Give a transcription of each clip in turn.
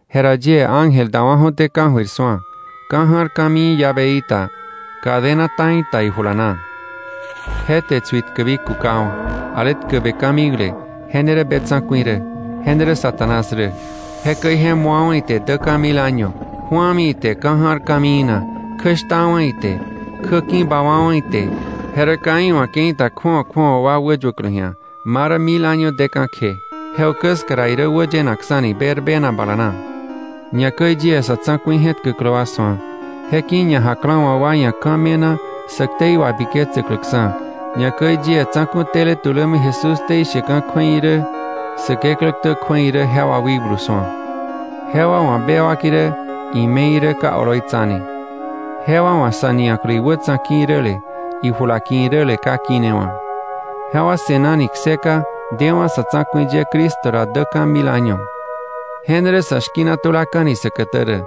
Jera yie ángel dawa̱ju̱té ka̱jöir su̱a, ka̱ ja̱r ka̱mii llaveí ta, cadena ta̱i ta ijula na. Je te tsuitkäbi kukawa̱, ale tkäbe ka̱mikle, je ne rä be tsa̱ku̱i rä, je ne rä Satanás rä. Jekäi je mu̱awa̱ ite däkka̱ mil año, ju̱ami ite ka̱ ja̱r ka̱mii na, kjäshtawa̱ ite, kjä ki̱bawa̱wa̱ ite, je rä ka iwa̱ ke̱i ta kju̱awa kju̱awa wäyuäklä ji̱a, ma rä mil año deka̱ kje. Je ukä ska ra irä wäyenaksa̱ni berbena bala na. Ñakäi yie sa̱ tsa̱ku̱i je̱tkäklä wa su̱a, je ki̱ ñajaklawa̱ wa ia̱ ka̱ me̱na sä ktei wabiketsäkläksa̱, ñakäi yie tsa̱ku̱ tele tulämi Jesús ktei sheka̱ kju̱ei irä, Säkeklä ktä kju̱ei irä jewa wikblu su̱a. Jewa wa̱ bewak irä, ime̱i irä ka oloitsane, jewa wa̱ sa̱ nia̱klä iwätsa̱ ki̱ iräle, ijula ki̱ iräle ka kinewa̱; jewa se̱nani kseka dewa̱ sa̱ tsa̱ku̱i ye Cristo ra däka̱ mil año. Je ne rä sa̱ shki̱na tulaka̱ni säkätä rä.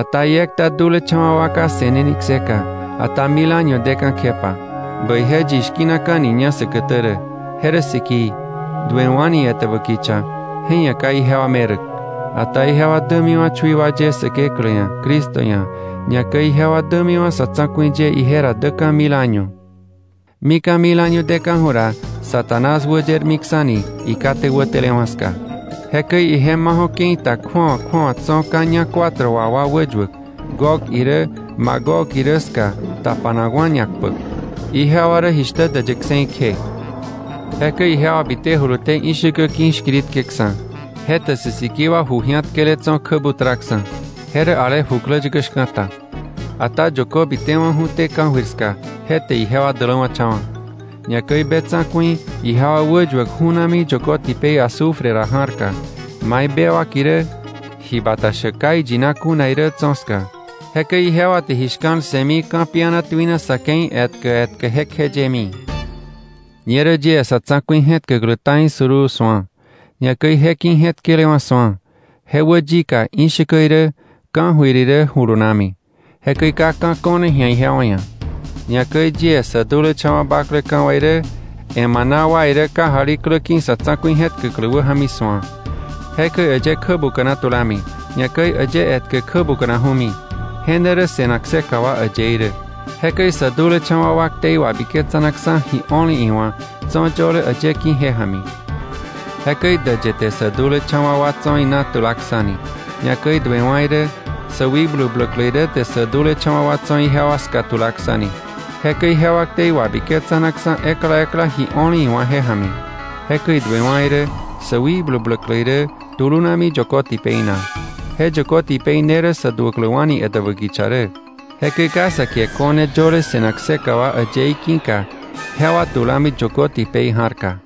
Ata iekta dulecha̱wa̱ wa ka se̱neni kseka, ata mil año deka̱ kjepa. Bäije yi shki̱naka̱niña säkätä rä; je rä sikii. Duewa̱ni etäbä kicha, je ia̱ ka ijewa meräk, ata ijewa dämiwa̱ chui wa ye Säkeklä ia̱, Cristo ia̱, ñakäi ijewa dämiwa̱ sa̱ tsa̱ku̱i ye ije ra däkka̱ mil año. Mika̱ mil año deka̱ju̱ ra, Satanás wäyermiksa̱ni ikate wätele ska. Jekäi ije maju̱ ke̱i ta kju̱awa kju̱awa tso̱ ka̱ ñak cuatro wa wäyuäk, Gog irä, Magog irä ska tapanakwa̱ ñakpäk. Ijewa rä jishtä däyë kse̱i kje. Jekäi ijewa bitejuluté ishäkä ki̱ shkiritkeksa̱, je te sä sikii wa ju ji̱atkele tso̱ kjä butraksa̱, je rä ale jukläyäkä shka̱ta. Ata yökö bitewa̱ju̱té ka̱jöir ska, je te ijewa däläwa̱cha̱wa̱. Ñakäi be tsa̱ku̱i ijewa wäyuäk ju̱nami yökö tipei azufre ra ja̱rka, mai bewak irä, ji bata shäk ka iyina kuna irä tso̱ ska. Jekäi ijewa te ji shka̱l ssëmi ka̱piana tuina sa̱ ke̱i etkä etkä jekjeyemi. Ñerä yie sa̱ tsa̱ku̱i je̱tkäklä ta̱i suruu su̱a, ñakäi je ki̱ je̱tkelewa̱ su̱a, je wä yika ishäkä irä, ka̱jöir irä julunami. Jekäi ka ka̱ ko̱ne ji̱a jewa ia̱. Ñakäi yie sä dulecha̱wa̱ bakleka̱ wa irä, emana wa irä kajali klä ki̱ sa̱ tsa̱ku̱i je̱tkäklä wäja̱mi su̱a. Jekäi äyë kjä buka̱na tulami, ñakäi äyë etkä kjä buka̱naju̱mi, je ne rä se̱nak kseka wa äyëí rä. Jekäi sä dulecha̱wa̱ wa ktei wabiketsanaksa̱ ji o̱le iwa̱, tso̱ yöle äyë ki̱ je ja̱mi. Jekäi däyë te sä dulecha̱wa̱ wa tso̱ ina tulaksa̱ni, ñakäi duewa̱ irä, sä wikblu bläklä irä te sä dulecha̱wa̱ wa tso̱ ijewa ska tulaksa̱ni. Jekäi jewa ktei wabiketsanaksa̱ ekla ekla ji o̱le iwa̱ je ja̱mi. Jekäi duewa̱ irä, sä wikblu bläklä irä tulunami yökö tipei na. Je yökö tipei ne rä sä duäkläwa̱ni etäbä kicha rä. Jekäi ka sä kie ko̱ne yöle se̱nak kseka wa äyëí ki̱ka, jewa tulami yökö tipei ja̱rka.